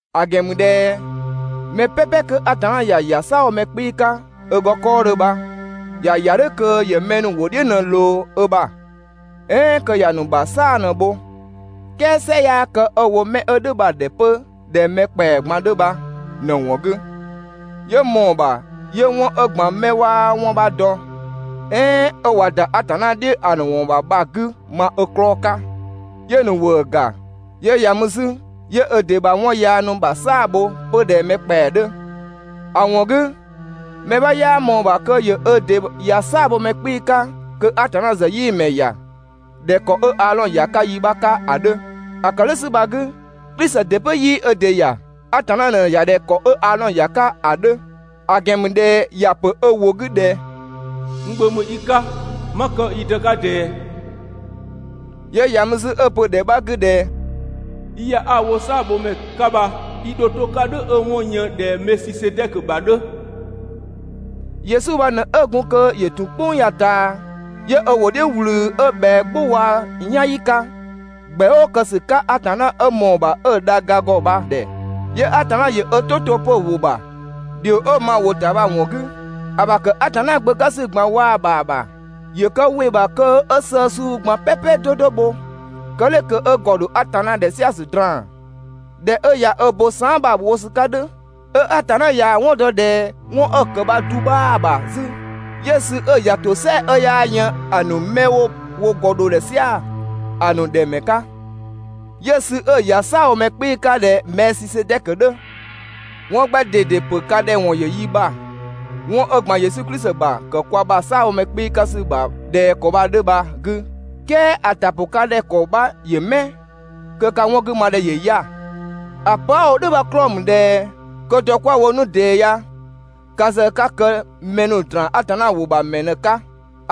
‑A ‑gɛn ‑mü ꞊dhɛ mɛ "pɛpɛ 'kö Atanna ‑ya ‑ya "saabhomɛ 'kpii‑ 'ka ö ‑gɔ 'kɔɔdhö bha ‑ya ‑ya "dhʋ̈ kö ‑yö mɛ ‑nu ‑wʋ "dhiʋ̈ ꞊në‑ ꞊loo ö ‑bha, "ɛɛn kö ‑ya ‑nu ‑bha "saa‑ ꞊në‑ bho. "Kɛɛ "sɩ 'yaa kë 'ö‑ wo 'mɛ 'ö "dhʋ̈ bha‑ ‑dhɛ 'pö ꞊dhɛ mɛ ‑kpɛa ꞊gban 'dhö bha ꞊në‑ ‑wɔn 'gü, 'yö ꞊mɔɔ‑ ‑bha 'yö 'wɔn 'ö ‑gban 'mɛ 'waa 'wɔn 'bha dɔ, "ɛɛn 'ö ꞊wa ‑da Atanna "dhiʋ̈ ‑a ‑nu ‑wɔn ‑bha bha‑ 'gü ma ö 'klɔɔ‑ 'ka, 'yö‑ ‑nu ‑wëë ‑ga. 'Yö ‑ya mü 'zü 'yö ö ‑dɩ ‑bha 'wɔn yaa ‑nu ‑bha 'saa‑ bho 'pö ꞊dhɛ mɛ ‑kpɛa 'dhö. ‑A ‑wɔn 'gü, mɛ 'bha 'yaa ꞊mɔɔ‑ ‑bha kö ‑yö ö ‑dɩ ‑ya "saabhomɛ 'kpii‑ 'ka kö Atanna ‑zë 'yii‑ ‑mɛ ‑ya ꞊dhɛ ‑kɔ 'ö Aadhɔn ‑ya 'ka yi 'bha 'ka ‑a 'dhö. ‑A ‑kë "dhʋ̈ ‑sü bha‑ 'gü, Klisi ‑dɩ 'pö 'yii ö ‑dɩ ‑ya. Atanna ꞊në‑ ‑ya ꞊dhɛ ‑kɔ 'ö Aadhɔn ‑ya 'ka ‑a 'dhö, ‑a ‑gɛn ‑mü ꞊dhɛ ‑ya ‑pö ö ‑wʋ 'gü ꞊dhɛ: «N Gbö ‑mü i 'ka, 'ma kë i Dë 'ka ꞊dɛɛ.» 'Yö ‑ya mü 'zü 'ö‑ pö ‑dhɛ 'bha 'gü ꞊dhɛ: «I ‑ya 'a‑ wo "saabhomɛ 'ka bha, i ‑dho 'to‑ 'ka "dhʋ̈ 'ö‑ 'wɔn‑ yën ꞊dhɛ Mɛɛsisedɛkö ‑bha 'dhö.» Yesu bha ꞊në 'ö gun kö ‑yö ‑tun "kpʋng ya‑ ꞊taa, 'yö ö ‑wʋ "dhiʋ̈ ꞊wlü 'ö ꞊bhɛa "gbʋ waa‑ "yanyi 'ka, ‑gbɛ "ʋʋ kë ‑sü 'ka Atanna 'ö ꞊mɔɔ‑ ‑bha 'ö‑ dha ga ‑gɔ bha‑ ‑dhɛ, 'yö Atanna ‑yö ö "tʋ 'to 'pö‑ ‑wʋ ‑bha ‑dhio 'ö‑ ma‑ ‑wʋ ‑ta bha‑ ‑wɔn 'gü. ‑A ‑bha ‑kë Atanna Gbö 'ka ‑sü ꞊gban waa‑ ‑bha ‑bha, ‑yö kë ‑wɩ ‑bha kö 'ö sëë suu ꞊gban "pɛpɛ 'do 'do bho. Kë "dhʋ̈ kö 'ö ‑gɔ ‑dho Atanna ‑dhɛ "sia‑ ‑sü draan‑. ꞊Dhɛ 'ö ꞊ya bo saan" bha‑ wo ‑sü 'ka "dhʋ̈, 'ö Atanna ꞊yaa‑ 'wɔn dɔ ꞊dhɛ 'wɔn 'ö‑ ‑kë bha‑ du 'bhaa‑ ‑bha 'zü, 'yö‑ sü 'ö‑ ‑ya ‑tosɛa 'ö 'yaa yën ‑a ‑nu 'mɛ 'wo wo ‑gɔ dho‑ ‑dhɛ "sia‑ ‑a ‑nu ‑dhɛ ‑mɛ 'ka, 'yö‑ sü 'ö‑ ‑ya "saabhomɛ 'kpii‑ 'ka ꞊dhɛ Mɛɛsisedɛkö 'dhö. 'Wɔn 'gbɛ ꞊dede ‑pö ka ‑dhɛ ‑wɔn ‑yö yi ‑bha 'wɔn 'ö ‑gban Yesu Klisi ‑bha ‑kë kwa ‑bha "saabhomɛ 'kpii‑ 'ka ‑sü ‑bha ꞊dhɛ ‑kɔ bha‑ 'dhö bha‑ 'gü, "kɛɛ ‑a ‑ta ‑pʋ ka ‑dhɛ ‑kɔ 'bha ‑yö 'mɛ kö ka 'wɔn 'gü ma ‑dhɛ ‑yö 'ya‑. ‑A pö 'a‑ wo "dhʋ̈ bha‑ 'klɔɔ‑ ‑mü ꞊dhɛ kö dɔ 'kwa‑ wo 'nu ꞊dɛɛ ya, ka ‑zë 'ka kë mɛ ‑nu ‑draan Atanna ‑wʋ ‑bha ‑mɛ ꞊në‑ 'ka.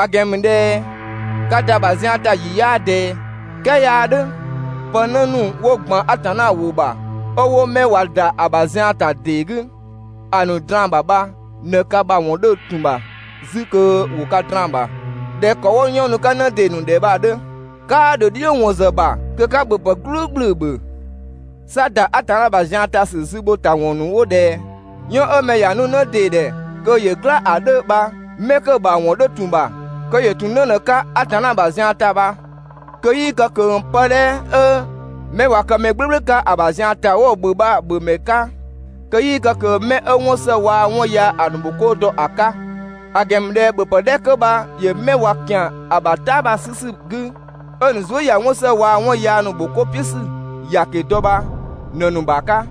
‑A ‑gɛn ‑mü ꞊dhɛ ka ‑da ‑bha zian ‑ta ‑yi 'yaa ꞊dɛɛ, "kɛɛ 'yaa "dhʋ̈. Pë 'në ‑nu 'wo ‑gban Atanna ‑wʋ ‑bha 'ö 'wo 'mɛ ꞊wa ‑da ‑a ‑bha zian ‑ta ‑dee 'gü, ‑a ‑nu ꞊draan‑ ‑bha bha ꞊në ka bha ‑wɔn 'dhö ‑tun ‑bha 'zü kö ‑wo ka draan‑ ‑bha ꞊dhɛ ‑kɔ 'wo 'yɔn nu‑ 'ka 'në ‑dee ‑nu ‑dhɛ bha‑ 'dhö. 'Kaa ‑dho "dhiʋ̈ ‑wɔn ‑zë ‑bha kö 'ka ‑bhöpë "gblʋ̈ʋ̈gblʋ̈ ‑bhö. 'Sa ‑da Atanna ‑bha zian ‑ta ‑sü zü ‑bho ‑ta ‑wɔn ‑nu 'wo ꞊dhɛ 'yɔn 'ö mɛ ‑ya nu 'në ‑dee ‑dhɛ kö ‑yö "gla ‑a 'dhö bha 'mɛ 'kö‑ ‑bha ‑wɔn 'dhö ‑tun ‑bha, kö ‑yö ‑tun 'në ꞊në‑ 'ka Atanna ‑bha zian ‑ta bha, kö 'yii kë ꞊kö pë 'dhɛ 'ö 'mɛ ꞊wa kë mɛ "gblʋ̈gblʋ̈ 'ka ‑a ‑bha zian ‑ta 'wo‑ ‑bhö bha‑ ‑bhö ‑mɛ 'ka, kö 'yii kë ꞊kö 'mɛ 'ö 'wɔn ‑së waa‑ 'wɔn yaa ‑a ‑nu ‑bhokoo dɔ ‑a 'ka, ‑a ‑gɛn ‑mü ꞊dhɛ ‑bhöpë 'dhɛ 'kö bha ‑yö 'mɛ ꞊wa ‑kian ‑a ‑bha "ta bha‑ 'sü ‑sü 'gü, 'ö‑ ‑nu zuë" ꞊ya 'wɔn ‑së waa‑ 'wɔn yaa ‑nu ‑bho 'ko "piʋ̈ ‑sü ‑yaki dɔ bha ꞊në‑ ‑nu ‑bha 'ka.